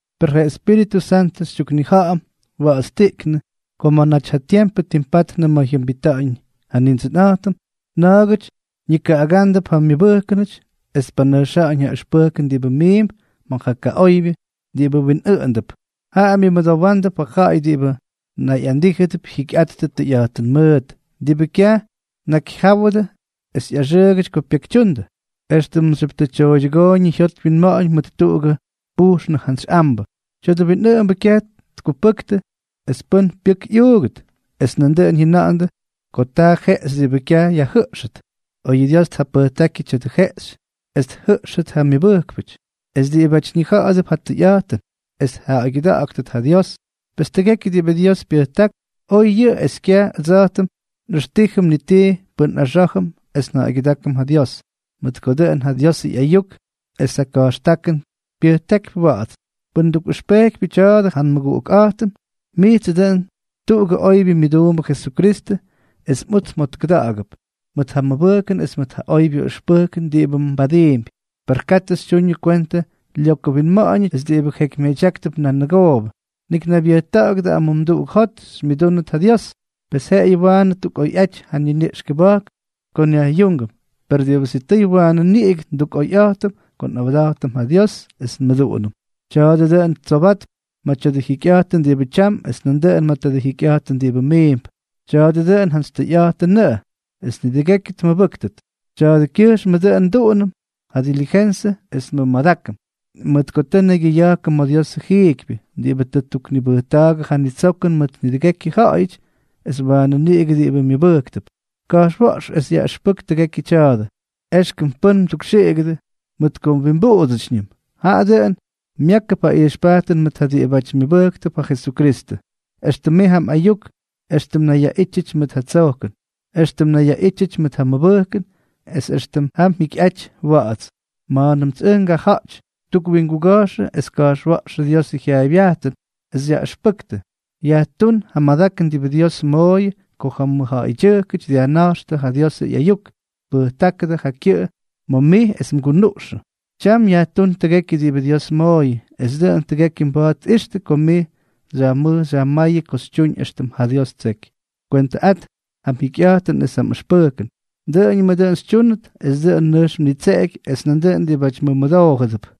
Per ja Espíritʉ Santʉ xytyuknija̱ꞌa̱m wa̱ꞌa̱tstiꞌknʉ ko ma̱ naty ja tiempʉ ttimpatnʉ ma̱ jyʉmbita̱ꞌa̱ñ Nindsʉnꞌa̱jtʉm, na̱a̱gʉty ñikaꞌagándʉp ja myʉbʉjkʉnʉty es tpanʉjxa̱ꞌa̱ñ ja ʉxpʉjkʉn diꞌibʉ miimp ma̱ ja kaꞌoybyʉ diꞌibʉ winꞌʉꞌʉndʉp. Jaꞌa myʉmʉdowándʉp ja ja̱ꞌa̱y diꞌibʉ nayꞌandíjʉdʉp jyikyꞌattʉ tʉyꞌa̱jtʉn mʉʉt, diꞌibʉ kyaj tnakyjyáwʉdʉ es ꞌyaxʉʉgʉty ko pyekytyundʉ, éxtʉmxyʉp tʉ tyooydyʉgooyñʉ jyot wyinma̱ꞌa̱ñ mʉt tuꞌugʉ pujxnʉ jantsy ambʉ. Tya̱dʉ winꞌʉꞌʉmbʉ kyaj tkupʉktʉ es pʉ́n pyʉk ꞌyuugʉt, es nandʉꞌʉn jyʉna̱ꞌa̱ndʉ ko taa jeꞌxy diꞌibʉ kyaj yajjʉꞌxʉt, oy ja Dios tjapʉjtákyʉ tya̱dʉ jeꞌxy es tjʉꞌxʉt ja myʉbʉjkpʉty es diꞌibáty ñija̱ꞌa̱dʉp ja tʉyꞌa̱jtʉn, es tja̱ꞌa̱ygyʉda̱ꞌa̱ktʉt ja Dios. Pes tʉgekyʉ diꞌibʉ Dios pyʉjták, oy yʉꞌʉ es kyaj ʉdsa̱jtʉm nꞌʉxtíjʉm ni tii pʉn nꞌaxá̱jʉm es nja̱ꞌa̱ygyʉdákʉm ja Dios, mʉt ko dʉꞌʉn ja Diosʉ ꞌyayuk es ja ka̱jxtákʉn pyʉjtákypy wa̱ꞌa̱ts. Pʉn mdukꞌʉxpejkypyʉ tya̱a̱dʉ ja nmʉguꞌukꞌa̱jtʉm, mijtsʉ dʉꞌʉn tuꞌugʉ oybyʉ myʉduumbʉ Jesukristʉ, es mꞌuts mjotkʉda̱ꞌa̱gʉp mʉt ja mʉbʉjkʉn es mʉt ja oybyʉ ʉxpʉjkʉn diꞌibʉ mbadiimpy. Per katʉ xytyuñʉ kwentʉ lyokʉ winma̱ꞌa̱ñʉty es diꞌibʉ jeky myadyáktʉp nan nʉgoobʉ. Nik naybyʉjta̱ꞌa̱gʉdʉ amumduꞌuk jot xymyʉdúnʉt ja Dios. Pes jeꞌeyʉ waanʉ ttukꞌoyꞌaty ja niniꞌx kʉba̱jk ko nyajꞌyúngʉm, per diꞌibʉ sitʉy waanʉ niꞌigʉ ndukꞌoyꞌa̱jtʉm ko nꞌawda̱jtʉm ja Dios es nmʉduꞌunʉm. Taadʉ dʉꞌʉn tsobatp ma̱ tya̱dʉ jikyꞌa̱jtʉn diꞌibʉ tyam es nandʉꞌʉn ma̱ tadʉ jikyꞌa̱jtʉn diꞌibʉ miimp. Tya̱a̱dʉ dʉꞌʉn jantsy tʉyꞌa̱jtʉnʉꞌʉ, es nidʉgekyʉ tmʉbʉ́ktʉt. Tya̱a̱dʉkyʉjxmʉ dʉꞌʉn nduꞌunʉm ja delijensʉ es nmʉmadákʉm, mʉt ko tʉ nnaygyʉya̱jkʉm ma̱ Diosʉ jiikypyʉ, diꞌibʉ tʉ ttuknibʉjta̱a̱gʉ ja nitsokʉn mʉt nidʉgekyʉ ja̱ꞌa̱yʉty, es waanʉ niꞌigʉ diꞌibʉ myʉbʉjktʉp. Ka̱jxwa̱ꞌx es yaꞌʉxpʉk tʉgekyʉ tya̱a̱dʉ. Exkʉm pʉ́n mdukxiꞌigʉdʉ mʉt ko mwimbuꞌudsʉtyñʉm; jaꞌa dʉꞌʉn myákʉp ja ijxpajtʉn mʉt ja diꞌibáty myʉbʉjktʉp ja Jesukristʉ, éxtʉm mij ja mꞌayuk, éxtʉm mnayyaꞌítyʉty mʉt ja tsojkʉn, éxtʉm mnayyaꞌítyʉty ma̱ ja mʉbʉjkʉn, es extʉm ja mjikyꞌaty wa̱ꞌa̱ts. Ma̱a̱nʉmts ʉj ngaja̱ꞌty, tukwinguga̱jxʉdʉ es ka̱jxwa̱ꞌx ja Diosʉ jyaaybyajtʉn, es xyaꞌʉxpʉktʉ. Yajtún ja madakʉn diꞌibʉ Dios mmooyʉ ko ja mʉjja̱ꞌa̱ydyʉjkʉty dyajnáxtʉ ja Diosʉ ꞌyayuk, tpʉjtáktʉ ja kyʉꞌʉ ma̱ mij es mgunuꞌxʉ. Tyam yajtún tʉgekyʉ diꞌibʉ Dios mmooyʉ, es dʉꞌʉn tʉgekyʉ mba̱a̱t tꞌixtʉ ko mij xyajmʉj xyajmáyʉ ko xytyuñ éxtʉm ja Dios ttseky. Kwentʉꞌat ja mjikyꞌa̱jtʉn es ja mꞌʉxpʉjkʉn. Dʉꞌʉñʉmʉ dʉꞌʉn xytyúnʉt, es dʉꞌʉn nʉjx mnitseꞌeky es nandʉꞌʉn diꞌibáty mmʉmʉdoojʉdʉp.